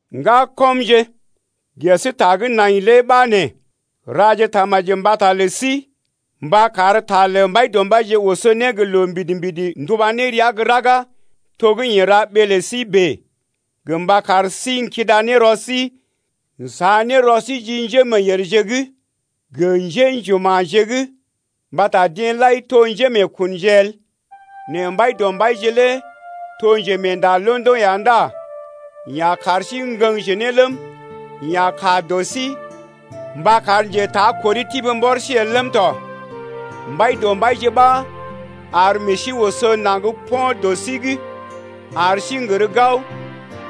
Ŋgakɔmje, ges ta gə́ nai lé ɓa nee: Raje tamaji mbata lə sí mba kar ta lə Mbaidɔmbaije oso ne gə loo mbidi-mbidi nduba ne rəa gə́ raga, to gə́ yee ra ɓee lə sí bèe gə mba kar sí n’kida rɔ sí n’sa ne rɔ sí ji njémeeyèrje’g gə njḛ́juma̰je’g, mbata deḛ lai to njémeekunje el. Nɛ Mbaidɔmbaije lé to njemeenda londoŋ ya ndá yeḛ a kar sí ŋgəŋje ne ləm, yeḛ a kaa dɔ sí mba kar njetakori tibi mbɔr sí el ləm tɔ. Mbaidɔmbaije ɓa ar meḛ sí oso naŋg po̰ dɔ sí’g ar sí n’gər gao,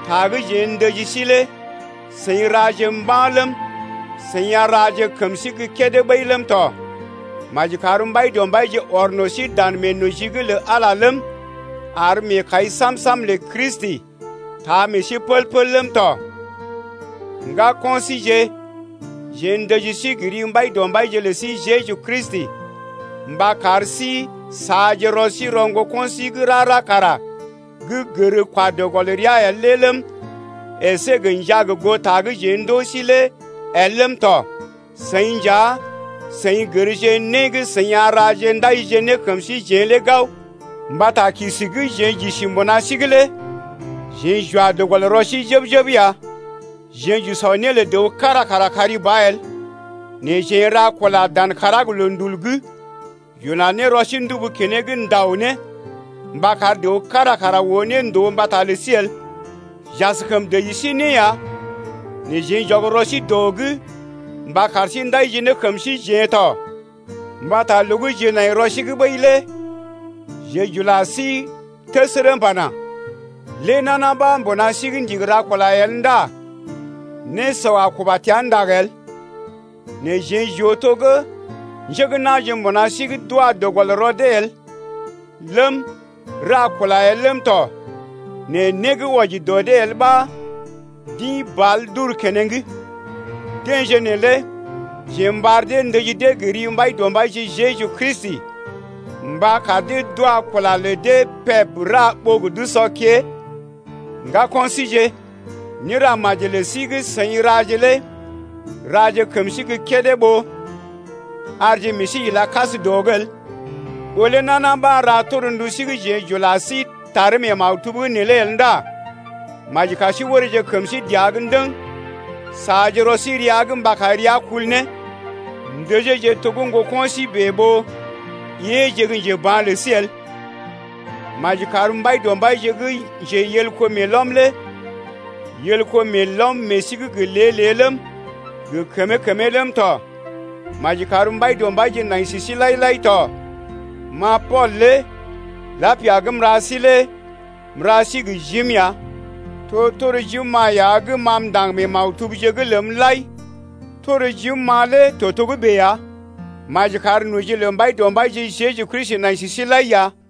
ta gə́ jeḛ ndəji sí lé seḭ raje mba̰ ləm, seḭ a raje kəm sí gə́ kédé ɓəi ləm tɔ. Maji kar Mbaidɔmbaije ɔr no̰ sí dan meenoji’g lə Ala ləm, ar meekai sam-sam lə Kristi taa meḛ sí pəl-pəl ləm tɔ. Ŋgako̰ síje, jeḛ ndəji sí gə ri Mbaidɔmbaije lə sí Jeju Kristi mba kar sí saaje rɔ sí rɔ ŋgoko̰ sí gə́ rara kara gə́ gər kwa dɔ gɔl rəa el lé ləm, əsé gə njaa goo ta gə́ jeḛ ndoo sí lé el ləm tɔ. Seḭ nja seḭ gərje né gə́ seḭ a raje ndajije ne kəm síjeḛ lé gao, mbata kisi gə́ jeḛ j’isi mbuna sí’g lé jeḛ j’wa dɔ gɔl rɔ sí jəb-jəb ya. Jeḛ j’usɔ né lə dəw kára kara kari ba el, nɛ jeḛ n’ra kula dan kàrá gə loondul’g, j’ula ne rɔ sí ndubu keneŋ n’dao ne mba kar dəw kára kara oo ne ndòo mbata lə sí el. J’askəm dəji sí né ya, nɛ jeḛ j’ɔg rɔ sí dɔ’g mba kar sí ndajije ne kəm síjeḛ tɔ. Mbata loo gə́ jeḛ nai rɔ sí’g ɓəi lé jeḛ j’ula sí təsərə m’pana: Lé nana ɓa mbuna sí’g ndigi ra kula el ndá nésɔ a kuba təa ndag el. Nɛ jeḛ j’oo to gə́ njé gə́ na̰je mbuna sí’g d’wa dɔ gɔl rɔ dee el ləm, ra kula el ləm tɔ nɛ né gə́ wɔji dɔ dee el ɓa d’ḭ bàl d’uru keneŋ. Deḛje neelé, jeḛ m’ɓar dee ndəji dee gə ri Mbaidɔmbaije Jeju Kristi mba kar dee d’wa kula lə dee peb ra ɓó gə d’usɔ kée. Ŋgako̰ síje, néra maji lə sí gə́ seḭ raje lé raje kəm sí gə́ kédé ɓó arje meḛ sí ila kas dɔ’g el. Ɓó lé nana ɓa ra torndu sí gə́ jeḛ j’ula sí taree mee maktub’g neelé el ndá maji kar sí oreeje kəm sí dəa’g ndəŋ, saaje rɔ sí rəa’g mba kar rəa kul ne. Ndəjeeje to gə́ ŋgoko̰ sí bèe ɓó éeje gə́ njeba̰ lə sí el. Maji kar Mbaidɔmbaije gə́ njeyelko meelɔm lé yel kó meelɔm meḛ sí’g gə lée-lée ləm, gə kəmee-kəmee ləm tɔ. Maji kar Mbaidɔmbaije nai sə sí lai-lai tɔ. Ma Pool lé lapia gə́ m’ra sí lé m’ra sí gə jim ya. To tor jim-ma ya gə́ ma m’ndaŋg mee maktubje’g ləm lai, tor jim-ma lé to togə́bè ya. Maji kar noji lə Mbaidɔmbaije Jeju Kristi nai sə sí lai ya.